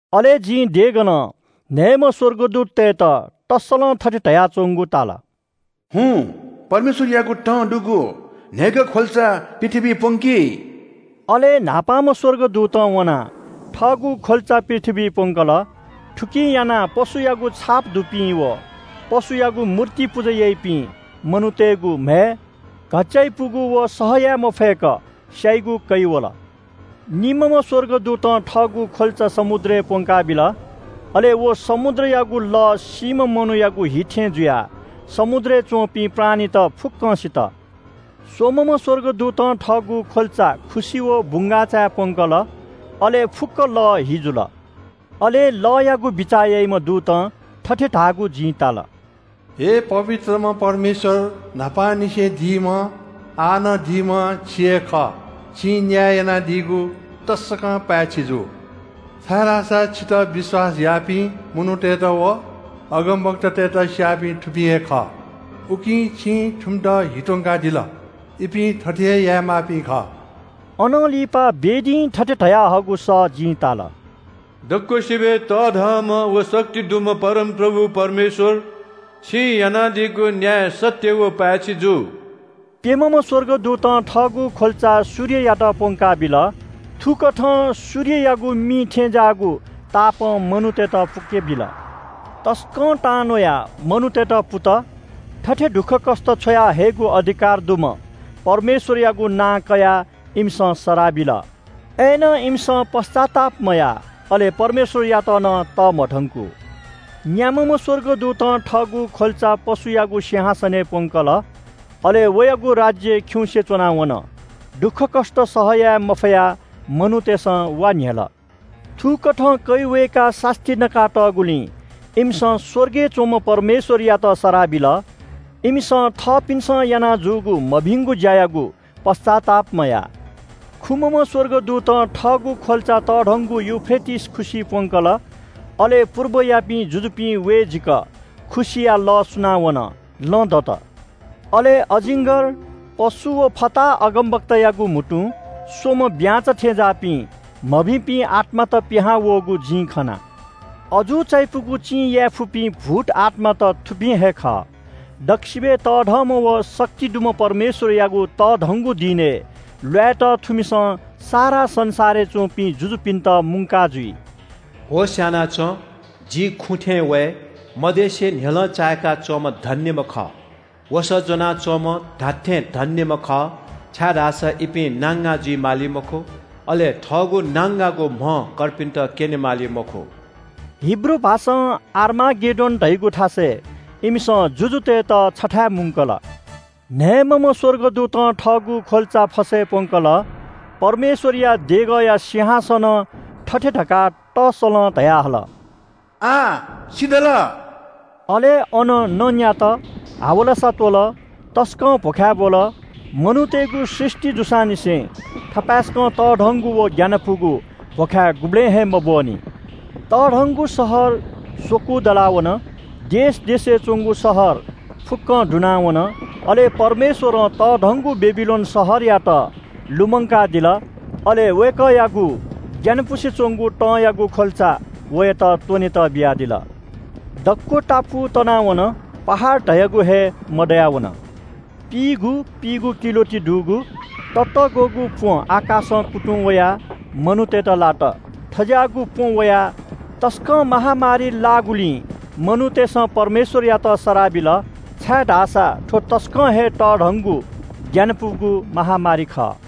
अले जिं देगलं न्‍हय्‌म्‍ह स्‍वर्गदूततय्‌त तस्‍सलं थथे धयाच्‍वंगु ताल – “हुँ, परमेश्‍वरयागु तं दुगु न्‍हय्‌गः ख्‍वल्‍चा पृथ्‍वीइ प्‍वंकि।” अले न्‍हापांम्‍ह स्‍वर्गदूतं वनाः थःगु ख्‍वल्‍चा पृथ्‍वीइ प्‍वंकल। थुकिं यानाः पशुयागु छाप दुपिं व पशुयागु मूर्ति पुजा याइपिं मनूतय्‌गु म्‍हय् घच्‍चाइपुगु व सह याये मफय्‌क स्‍याइगु कै वल। निम्‍हम्‍ह स्‍वर्गदूतं थःगु ख्‍वल्‍चा समुद्रय् प्‍वंकाबिल। अले व समुद्रयागु लः सीम्‍ह मनूयागु हि थें जुयाः समुद्रय् च्‍वंपिं प्राणीत फुक्‍कं सित। स्‍वम्‍हम्‍ह स्‍वर्गदूतं थःगु ख्‍वल्‍चा खुसि व बुंगाःचाय् प्‍वंकल। अले फुक्‍क लः हि जुल। अले लःयागु बिचाः याइम्‍ह दूतं थथे धाःगु जिं ताल – “हे पवित्रम्‍ह परमेश्‍वर, न्‍हापांनिसें दीम्‍ह, आः नं दीम्‍ह छि हे खः। छिं न्‍याय यानादीगु तसकं पाय्‌छि जू। छाय्‌धाःसा छितः विश्‍वास याःपिं मनूतय्‌त व अगमवक्तातय्‌त स्‍याःपिं थुपिं हे खः। उकिं छिं थुमित हि त्‍वंकादिल। इपिं थथे हे यायेमाःपिं खः।” अनं लिपा वेदीं थथे धयाहःगु सः जिं ताल, “दक्‍वसिबय् तःधंम्‍ह व शक्ति दुम्‍ह परमप्रभु परमेश्‍वर, छिं यानादीगु न्‍याय सत्‍य व पाय्‌छि जू।” प्‍यम्‍हम्‍ह स्‍वर्गदूतं थःगु ख्‍वल्‍चा सूर्ययात प्‍वंकाबिल। थुकथं सूर्ययागु मि थें ज्‍याःगु तापं मनूतय्‌त पुकेबिल। तसकं तांन्‍वयाः मनूतय्‌त पुत। थथे दुःखकष्‍ट छ्वयाहयेगु अधिकार दुम्‍ह परमेश्‍वरयागु नां कयाः इमिसं सराः बिल। अय्‌नं इमिसं पश्‍चाताप मयाः अले परमेश्‍वरयात नं तःमधंकू। न्‍याम्‍हम्‍ह स्‍वर्गदूतं थःगु ख्‍वल्‍चा पशुयागु सिंहासनय् प्‍वंकल। अले वयागु राज्‍य खिउँसे च्‍वना वन। दुःखकष्‍ट सह याये मफयाः मनूतय्‌सं वा न्‍ह्यल। थुकथं कै वय्‌काः सास्‍ती नका तःगुलिं इमिसं स्‍वर्गय् च्‍वंम्‍ह परमेश्‍वरयात सराः बिल। इमिसं थःपिन्‍सं याना जूगु मभिंगु ज्‍यायागु पश्‍चाताप मयाः। खुम्‍हम्‍ह स्‍वर्गदूतं थःगु ख्‍वल्‍चा तःधंगु यूफ्रेटिस खुसिइ प्‍वंकल। अले पुर्बयापिं जुजुपिं वये जीक खुसिया लः सुनावन, लँ दत। अले अजिङ्‌गर, पशु व फताहा अगमवक्तायागु म्‍हुतुं स्‍वम्‍ह ब्‍यांचा थें ज्‍याःपिं मभिंपिं आत्‍मात पिहां वःगु जिं खना। अजू चायापुगु चिं यायेफुपिं भूत आत्‍मात थुपिं हे खः। दक्‍वसिबय् तःधंम्‍ह व शक्ति दुम्‍ह परमेश्‍वरयागु तःधंगु दिनय् ल्‍वायेत थुमिसं सारा संसारय् च्‍वंपिं जुजुपिन्‍त मुंका जुइ। “होश‍ यानाच्‍वँ, जि खुँ थें वये। मद्यंसे न्‍ह्यलं चाय्‌का च्‍वंम्‍ह धन्‍यम्‍ह खः। वसः ज्‍वना च्‍वंम्‍ह धात्‍थें धन्‍यम्‍ह खः, छाय्‌धाःसा इपिं नांगां जुइ माली मखु। अले थःगु नांगांगु म्‍ह कर्पिन्‍त क्‍यने माली मखु।” हिब्रू भाषां आर-मागेड्डोन धाइगु थासय् इमिसं जुजुतय्‌त छथाय् मुंकल। न्‍हय्‌म्‍हम्‍ह स्‍वर्गदूतं थःगु ख्‍वल्‍चा फसय् प्‍वंकल। परमेश्‍वरया देगःया सिंहासनं थथे धकाः तसलं धयाहल – “आः सिधल।” अले अन न न्‍यात, हावलासा त्‍वल, तसकं भ्‍वखाय् ब्‍वल। मनूतय्‌गु सृष्‍टि जूसांनिसें थपाय्‌सकं तःधंगु व ग्‍यानापुगु भ्‍वखाय् गुबलें हे मब्‍वःनि। तःधंगु शहर स्‍वकू दला वन। देश देशय् च्‍वंगु शहर फुक्‍कं दुनावन। अले परमेश्‍वरं तःधंगु बेबिलोन शहरयात लुमंकादिल। अले वय्‌कःयागु ग्‍यानापुसे च्‍वंगु तंयागु ख्‍वल्‍चा वयात त्‍वनेत बियादिल। दक्‍व टापु तनावन। पहाड धयागु हे मदयावन। पिइगु पिइगु किलो ति दुगु ततःग्‍वःगु प्‍वँ आकाशं कुतुं वयाः मनूतय्‌त लात। थज्‍याःगु प्‍वँ वयाः तसकं महामारी लाःगुलिं मनूतय्‌सं परमेश्‍वरयात सराः बिल, छाय्‌धाःसा थ्‍व तसकं हे तःधंगु ग्‍यानापुगु महामारी खः।